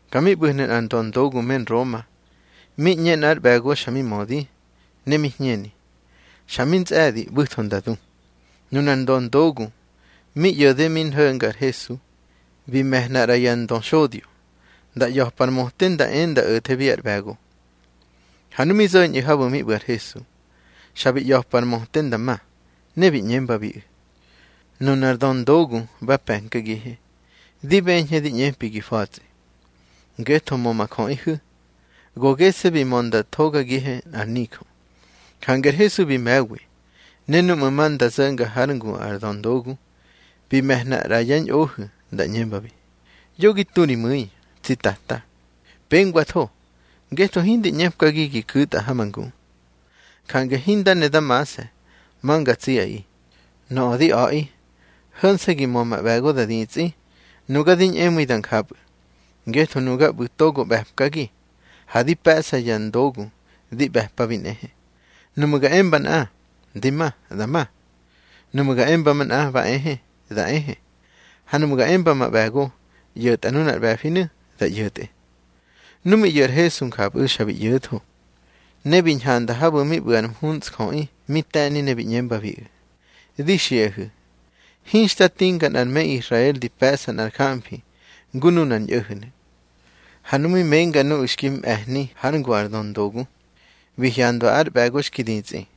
Ka mi ꞌbu̱hnu̱ nꞌar döndogu me Nroma, mi ꞌñe nꞌár ꞌbe̱go xa mi mödi, ne mi hñeni, xa mi ntsꞌe̱di, ꞌbu̱tho nda du. Nunar döndogu mi ꞌyo̱de mi nho̱nga ar Hesu, bi me̱hna ꞌra ya ndöxodyo, nda ꞌya̱pa ar möte nda e nda o̱thebi ár ꞌbe̱go. Ha nu mi zo̱ñꞌu̱ habu̱ mi ꞌbu̱ ar Hesu, xa bi ꞌya̱pa ar möte nda ma, ne bi ꞌñembabiꞌu̱: —Nunar döndogu ba pe̱nkagihe, di beñhe di ꞌñepabi gi fa̱tsꞌi. Ngetho mö ma jöꞌihu̱, go gese̱ bi mö nda thogagihe nꞌar nijö. Jange ar Hesu bi me̱wi. Ne núꞌmu̱ ma nda zo̱nga hár ngu ar döndogu, bi me̱hna ꞌra yá ñꞌohu̱ nda ꞌñembabi: —Yo gi tu ri mu̱i, tsi Tata. Pengwatho, ngetho hindi ꞌñepkagi gi ku̱tꞌa ha ma ngu. Jange hinda ne da mase̱ ma nga tsiꞌaꞌi. Nöꞌö di a̱ꞌi, ho̱nse̱ gi mö ma ꞌbe̱go da ditsꞌi, nuga di ñꞌemu̱i da njapꞌu̱. Ngetho nuga ꞌbu̱ togo ꞌbe̱pkagi, ha di pe̱ꞌsa ya ndogu di ꞌbe̱pabi nꞌehe. Nuꞌmu̱ ga emba nꞌa: Di ma, da ma. Nuꞌmu̱ ga emba manꞌa: Ba ehe, da ehe. Ha nuꞌmu̱ ga emba ma ꞌbe̱go: ꞌYo̱tꞌa nunar ꞌbe̱finu̱, da ꞌyo̱tꞌe. Nu mi ꞌyo̱ ar Hesu njapꞌu̱, xa bi ꞌyo̱tho. Ne bi ñhanda habu̱ mi ꞌbu̱ ar mhuntsjöꞌi mi te̱ni, ne bi ꞌñembabiꞌu̱: —Di xiꞌahu̱, hinxta tinga nꞌar me Israel di pe̱ꞌsa nꞌar jamfi ngu nunar ñꞌo̱ho̱nu̱. Ha nu mi menga nuꞌu̱ xki mꞌe̱hni hár ngu ar ndöndogu, bi hyandwa ár ꞌbe̱go xki ditsꞌi.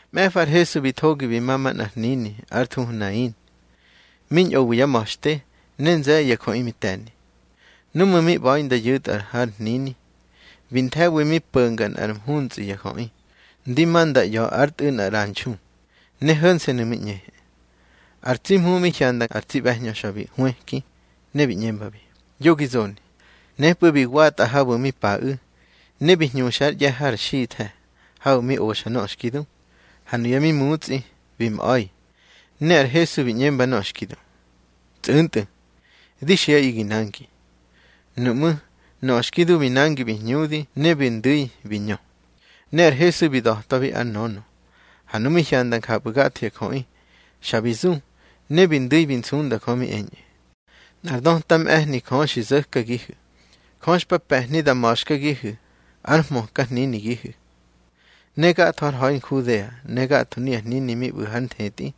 Mꞌe̱fa ar Hesu bi thogi bi ma manꞌar hnini ár thuhu Nain, mi ñꞌowi yá ma̱xte, ne nze̱ye̱ ya jöꞌi mi te̱ni. Núꞌmu̱ mi ꞌba̱i nda yu̱tꞌa har hnini, bi nthe̱wi mi po̱nga nꞌár mhuntsꞌi ya jöꞌi, ndi ma nda ꞌya̱ ár tꞌu̱ nꞌar ꞌranxu, ne ho̱nse̱nu̱ mi ꞌñehe. Ar tsi Hmu mi hyanda ar tsi ꞌbe̱hñö, xa bi hwëki ne bi ꞌñembabi: —Yo gi zoni. Nepꞌu̱ bi watꞌa habu̱ mi paꞌu̱, ne bi hñuxa ár ꞌye̱ har xithe̱ habu̱ mi oxa nöꞌö xki du. Ha nuya mi mutsꞌi bi mꞌa̱i, ne ar Hesu bi ꞌñemba nöꞌö xki du: —Tsꞌu̱ntꞌu̱, di xiꞌaꞌi gi nangi. Nuꞌmú̱ nöꞌö xki du bi nangi bi hñudi, ne bi ndu̱i bi ñö. Ne ar Hesu bi da̱twabi ár nönö. Ha nu mi hyanda njapꞌu̱ gatho ya jöꞌi, xa bi zu, ne bi ndu̱i bi nsunda Jö mi eñꞌu̱: —Nꞌar döta mꞌe̱hni Jö xi zo̱kagihu̱. Jö xpa pe̱hni da ma̱xkagihu̱ ár hmöka hninigihu̱. Ne gatho har ha̱i Nhudea, ne gatho nuya hnini mi ꞌbu̱ hár nthetꞌi,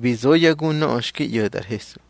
bi zo yá gu nöꞌö xki ꞌyo̱tꞌa ar Hesu.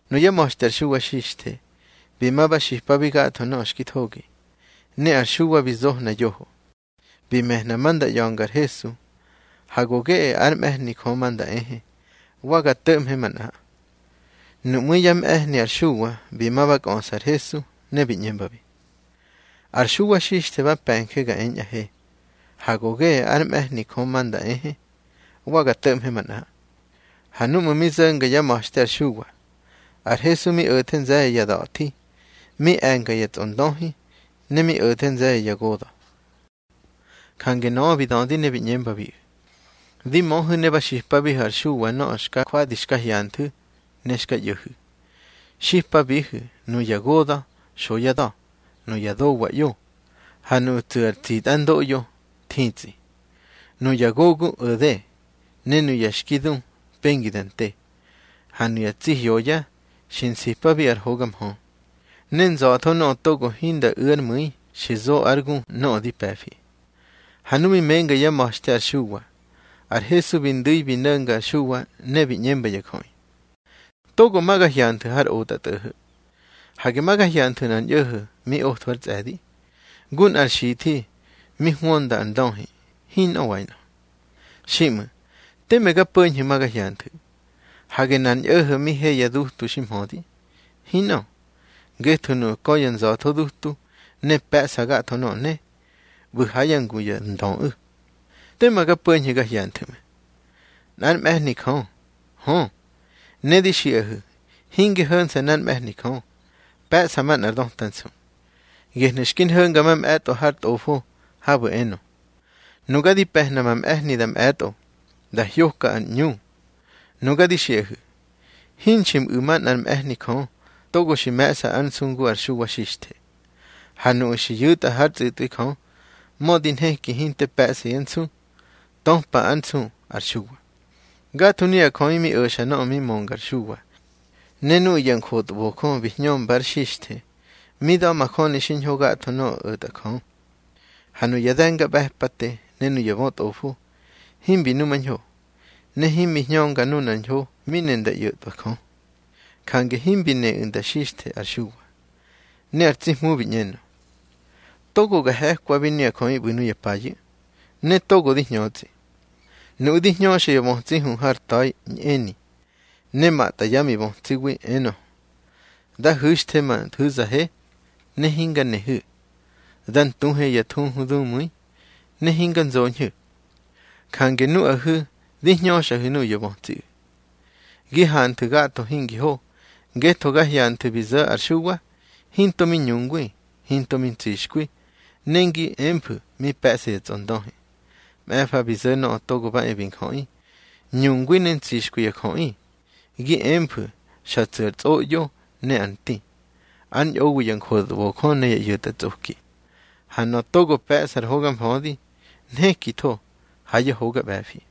Nuyá ma̱xte ar Xuwa Xixthe bi ma ba xipabi gatho nöꞌö xki thogi. Ne ar Xuwa bi zohna yoho, bi me̱hna ma nda ꞌya̱nga ar Hesu: Ha go geꞌe ár mꞌe̱hni Jö ma nda ehe, wa ga to̱ꞌmhe manꞌa. Nuꞌmú̱ yá mꞌe̱hni ar Xuwa bi ma ba kꞌöꞌsa ar Hesu, ne bi ꞌñembabi: —Ar Xuwa Xixthe ba pe̱nje ga eñꞌahe: Ha go geꞌe ár mꞌe̱hni Jö ma nda ehe, wa ga to̱ꞌmhe manꞌa. Ha núꞌmu̱ mi zo̱nga yá ma̱xte ar Xuwa, ar Hesu mi o̱the nze̱ye̱ ya da̱thi, mi e̱nga ya tsꞌondöhi, ne mi o̱the nze̱ye̱ ya goda̱. Jange nöꞌö bi dödi ne bi ꞌñembabiꞌu̱: —Di möhu̱ ne ba xipabihu̱ ar Xuwa nöꞌö xka jwadi xka hyanthu̱ ne xka ꞌyo̱hu̱. Xipabihu̱ nuya goda̱ xo yá da̱, nuya dowa ꞌyo, ha nuꞌu̱ tsu̱ ar tsitꞌandoꞌyo thitsꞌi. Nuya gogu o̱de, ne nuya xki du pengi da nte, ha nuya tsi hyoya xi nsipabi ar hoga mhö. Ne nza̱tho nöꞌö togo hinda u̱ ár mu̱i xi zo ár gu nöꞌö di pe̱fi. Ha nu mi menga yá ma̱xte ar Xuwa, ar Hesu bi ndu̱i bi no̱nga ar Xuwa, ne bi ꞌñemba ya jöꞌi: —Togo ma ga hyanthu̱ har otꞌatꞌo̱ho̱. Hage ma ga hyanthu̱ nꞌar ñꞌo̱ho̱ mi otho ár tsꞌe̱di, ngu nꞌar xithi mi hwönda ar ndöhi. Hinꞌö wainꞌö. Xiꞌmu̱ teme ga po̱ñhu̱ ma ga hyanthu̱. Hage nꞌar ñꞌo̱ho̱ mi he ya dutu xi mhödi. Hinꞌö, ngetho nuꞌu̱ kö ya nza̱tho dutu ne pe̱ꞌsa gatho nöꞌö ne, ꞌbu̱ ha yá ngu ya ndöꞌu̱. Tema ga po̱ñhu̱ ga hyanthu̱ ꞌmu̱. Nꞌár mꞌe̱hni Jö. Hö, ne di xiꞌahu̱ hinge ho̱nse̱ nꞌár mꞌe̱hni Jö, pe̱ꞌsa manꞌar döta nsu. Gehnu̱ xki nho̱nga mamꞌe̱tꞌo har Tꞌofo habu̱ enö: Nuga di pe̱hna ma mꞌe̱hni da mꞌe̱tꞌo, da hyokꞌa ar ꞌñu. Nuga di xiꞌahu̱, hinxi mꞌu̱ manꞌár mꞌe̱hni Jö togo xi me̱ꞌsa ár nsu ngu ar Xuwa Xixthe. Ha nuꞌu̱ xi yu̱tꞌa hár tsꞌu̱tꞌwi Jö, mödi nheki hinte pe̱ꞌsa yá nsu, töpa ár nsu ar Xuwa. Gatho nuꞌu̱ ya jöꞌi mi o̱xa nöꞌö mi mönga ar Xuwa, ne nuꞌu̱ ya njotbojö bi hñömbár xixthe, mi da̱majöni xiñho gatho nöꞌö o̱tꞌa Jö. Ha nuya de̱ngaꞌbe̱pate ne ya bötꞌofo, himbi numañho, ne himbi hñönga nunar ñho mi ne nda ꞌyo̱tꞌwa Jö. Jange himbi neꞌu̱ nda xixthe ar Xuwa. Ne ar tsi Hmu bi ꞌñenö: —Togo ga he̱kwabi nuya jöꞌi ꞌbu̱ nuya payu̱, ne togo di hñötsꞌi. Nuꞌu̱ di hñöxa ya bötsi hu har ta̱i ñꞌeni, ne matꞌa yá mibötsiwi, enö: Da hu̱xthe ma nthu̱zahe, ne hinga nehu̱. Da ntuhe ya thuhu dumu̱i, ne hinga nzoñhu̱. Jange nuꞌahu̱ di hñöxꞌahu̱ nuꞌu̱ ya bötsiꞌu̱, gi hanthu̱ gatho hingi ho. Ngetho ga hyanthu̱ bi zo̱ ar Xuwa, hinto mi ñungwi, hinto mi ntsixkwi, ne ngi emfu̱ mi pe̱ꞌsa ya tsꞌondöhi. Mꞌe̱fa bi zo̱ Nöꞌö Togo ba e bi Njöꞌi, ñungwi ne ntsixkwi ya jöꞌi, gi emfu̱ xa tsu̱ ar tsꞌoꞌyo ne ar nti, ár ñꞌowi ya njotbojö ne ya ꞌyo̱tꞌatsꞌoki. Ha nöꞌö togo pe̱ꞌsa ar hoga mfödi, nhekitho ha yá hoga ꞌbe̱fi.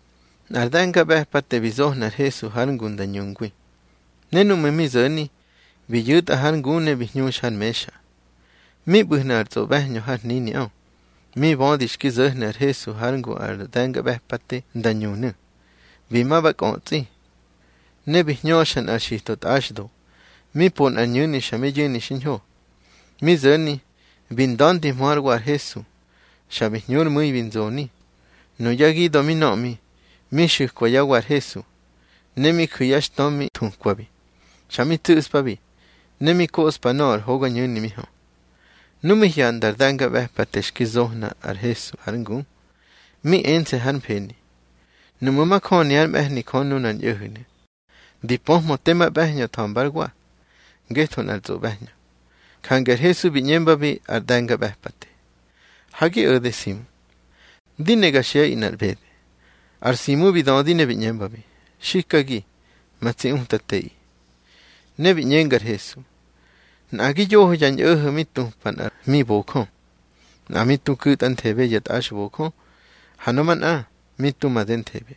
Nꞌar de̱ngaꞌbe̱pate bi zohna ar Hesu hár ngu nda ñungwi. Ne núꞌmu̱ mi zo̱ni bi yu̱tꞌa har ngu ne bi hñuxa har mexa. Mi ꞌbu̱hnu̱ nꞌar tsꞌoꞌbe̱hñö har hniniꞌö. Mi bödi xki zo̱hnu̱ ar Hesu hár ngu ar de̱ngaꞌbe̱pate nda ñunu̱, bi ma ba kꞌötsꞌi. Ne bi hñöxa nꞌar xito tꞌaxdo, mi po nꞌar ñu̱ni xa mi yu̱ni xiñho. Mi zo̱ni bi nda̱ndihmö hár wa ar Hesu, xa bi hñu ár mu̱i bi nzoni. Nuyá gida̱ mi nöꞌmi, mi xu̱kwa yá wa ar Hesu, ne mi ju̱ yá xtö mi thukwabi. Xa mi tsu̱spabi, ne mi koꞌspa nöꞌö ar hogañu̱ni mi hö. Nu mi hyanda ar de̱ngaꞌbe̱pate xki zohna ar Hesu hár ngu, mi ense̱ hár mfeni: Nuꞌmu̱ majöni ár mꞌe̱hni Jö nunar ñꞌo̱ho̱nu̱, di pöhmö tema ꞌbe̱hñö tha̱mba ár wa, ngetho nꞌar tsꞌoꞌbe̱hñö. Jange ar Hesu bi ꞌñembabi ar de̱ngaꞌbe̱pate: —Ha gi o̱de Simu. Di ne ga xiꞌaꞌi nꞌar ꞌbede. Ar Simu bi dödi ne bi ꞌñembabi: —Xikagi, ma tsi Utateꞌi. Ne bi ꞌñenga ar Hesu: —Nꞌagi yoho ya ñꞌo̱ho̱ mi tupa nꞌar hmibojö. Nꞌa mi tu ku̱tꞌanthebe ya tꞌaxbojö, ha nöꞌö manꞌa mi tu madenthebe.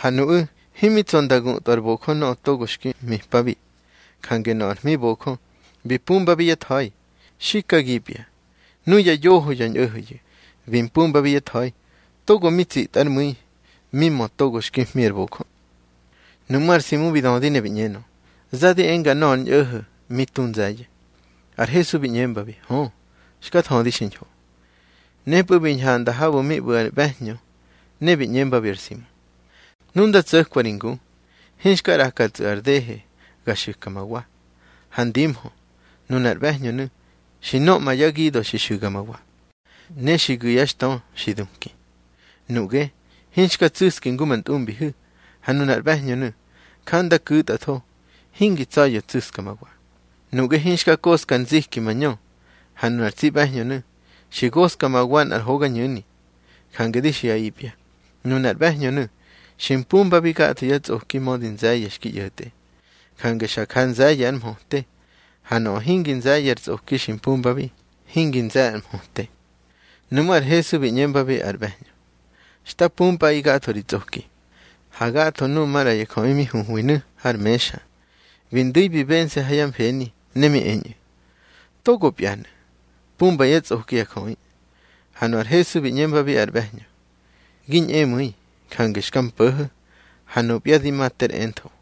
Ha nuꞌu̱ himi tsa̱ nda gutꞌwa ár bojö nöꞌö togo xki hmipabi. Jange nöꞌö ar hmibojö, bi pumbabi yá tha̱i. Xikagipya, nuya yoho ya ñꞌo̱ho̱yu̱ bi mpumbabi yá tha̱i, togo mi tsitꞌa ár mu̱i mi mö togo xki hmi ar bojö. Nuꞌmú̱ ar Simu bi dödi ne bi ꞌñenö: —Za di enga nöꞌö ar ñꞌo̱ho̱ mi tu nze̱ye̱. Ar Hesu bi ꞌñembabi: —Hö, xka thödi xiñho. Nepꞌu̱ bi ñhanda habu̱ mi ꞌbu̱ ar ꞌbe̱hñö, ne bi ꞌñembabi ar Simu: —Nu nda tso̱kwa ri ngu, hinxka ꞌrakatsꞌu̱ ar dehe ga xu̱ka ma wa. Ha ndimhö, nunar ꞌbe̱hñönu̱, xi nöꞌma yá gida̱ xi xu̱ga ma wa, ne xi gu̱ yá xtö xi duki. Nuꞌge hinxka tsu̱ski ngu ma ntꞌumbihu̱. Ha nunar ꞌbe̱hñönu̱, ja nda ku̱tꞌatho, hingi tsa̱ya̱ tsu̱ska ma wa. Nuꞌge hinga koꞌska ar nziki ma ñö, ha nunar tsi ꞌbe̱hñönu̱ xi goska ma wa nꞌar hogañu̱ni. Jange di xiꞌaꞌipya, nunar ꞌbe̱hñönu̱ xi mpumbabi gatho yá tsꞌoki, mödi nze̱ye̱ xki ꞌyo̱tꞌe, jange xa ja nze̱ye̱ ár mhöte. Ha nöꞌö hingi nze̱ye̱ ár tsꞌoki xi mpumbabi, hingi nze̱ ár mhöte. Nuꞌmú̱ ar Hesu bi ꞌñembabi ar ꞌbe̱hñö: —Xta pumpꞌaꞌi gatho ri tsꞌoki. Ha gatho nuꞌu̱ maꞌra ya jöꞌi mi huhwinu̱ har mexa, bi ndu̱i bi bense̱ ha yá mfeni, ne mi eñꞌu̱: —Togopyanu̱, pumba yá tsꞌoki ya jöꞌi. Ha nu ar Hesu bi ꞌñembabi ar ꞌbe̱hñö: —Gi ñꞌemu̱i, jange xka mpo̱ho̱, ha nupya di ma ter entho.